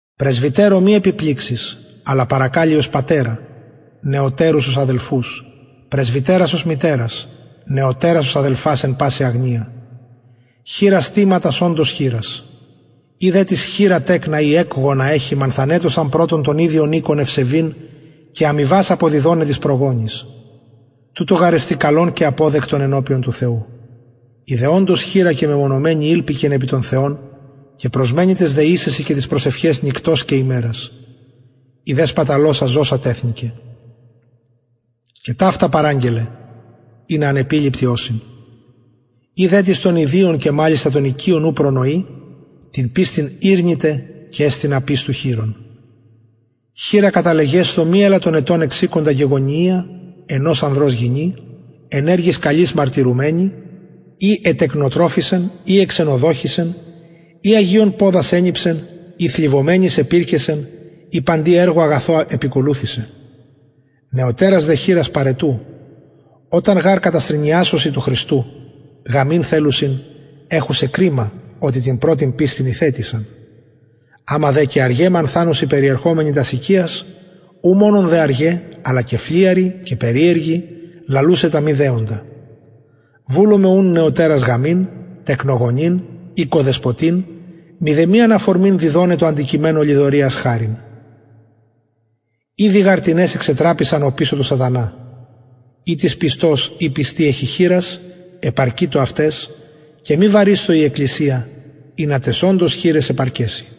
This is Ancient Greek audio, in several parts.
πρεσβυτερω μη επιπληξης αλλα παρακαλει ως πατερα νεωτερους ως αδελφους πρεσβυτερας ως μητερας νεωτερας ως αδελφας εν παση αγνεια χηρας τιμα τας οντως χηρας ει δε τις χηρα τεκνα η εκγονα εχει μανθανετωσαν πρωτον τον ιδιον οικον ευσεβειν και αμοιβας αποδιδοναι τοις προγονοις τουτο γαρ εστιν αποδεκτον ενωπιον του θεου η δε οντως χηρα και μεμονωμενη ηλπικεν επι τον θεον και προσμενει ταις δεησεσιν και ταις προσευχαις νυκτος και ημερας η δε σπαταλωσα ζωσα τεθνηκεν και ταυτα παραγγελλε ινα ανεπιληπτοι ωσιν ει δε τις των ιδιων και μαλιστα των οικειων ου προνοει την πιστιν ηρνηται και εστιν απιστου χειρων χηρα καταλεγεσθω μη ελαττον ετων εξηκοντα γεγονυια ενος ανδρος γυνη εν εργοις καλοις μαρτυρουμενη ει ετεκνοτροφησεν ει εξενοδοχησεν ει αγιων ποδας ενιψεν ει θλιβομενοις επηρκεσεν ει παντι εργω αγαθω επηκολουθησεν νεωτερας δε χηρας παραιτου οταν γαρ καταστρηνιασωσιν του χριστου γαμειν θελουσιν εχουσαι κριμα οτι την πρωτην πιστιν ηθετησαν αμα δε και αργαι μανθανουσιν περιερχομεναι τας οικιας ου μονον δε αργαι αλλα και φλυαροι και περιεργοι λαλουσαι τα μη δεοντα βουλομαι ουν νεωτερας γαμειν τεκνογονειν οικοδεσποτειν μηδεμιαν αφορμην διδοναι τω αντικειμενω λοιδοριας χαριν ηδη γαρ τινες εξετραπησαν οπισω του σατανα ει τις πιστος η πιστη εχει χηρας επαρκειτω αυταις και μη βαρεισθω η εκκλησια ινα ταις οντως χηραις επαρκεση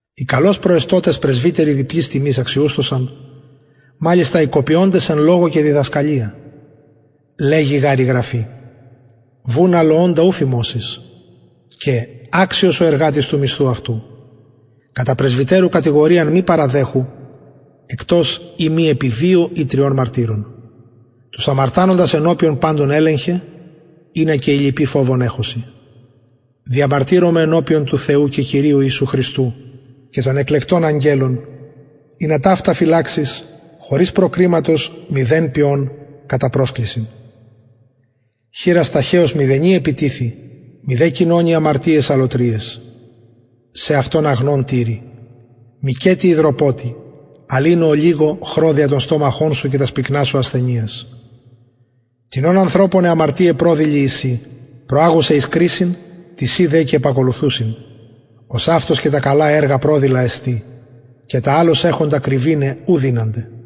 οι καλως προεστωτες πρεσβυτεροι διπλης τιμης αξιουσθωσαν μαλιστα οι κοπιωντες εν λογω και διδασκαλια λεγει γαρ η γραφη βουν αλοωντα ου φιμωσεις και αξιος ο εργατης του μισθου αυτου κατα πρεσβυτερου κατηγοριαν μη παραδεχου εκτος ει μη επι δυο η τριων μαρτυρων τους αμαρτανοντας ενωπιον παντων ελεγχε ινα και οι λοιποι φοβον εχωσιν διαμαρτυρομαι ενωπιον του θεου και κυριου ιησου χριστου και των εκλεκτων αγγελων ινα ταυτα φυλαξης χωρις προκριματος μηδεν ποιων κατα προσκλησιν χειρας ταχεως μηδενι επιτιθει μηδε κοινωνει αμαρτιαις αλλοτριαις σεαυτον αγνον τηρει μηκετι υδροποτει αλλ οινω ολιγω χρω δια τον στομαχον σου και τας πυκνας σου ασθενειας τινων ανθρωπων αι αμαρτιαι προδηλοι εισιν προαγουσαι εις κρισιν τισιν δε και επακολουθουσιν ωσαυτως και τα καλα εργα προδηλα εστιν και τα αλλως εχοντα κρυβηναι ου δυνανται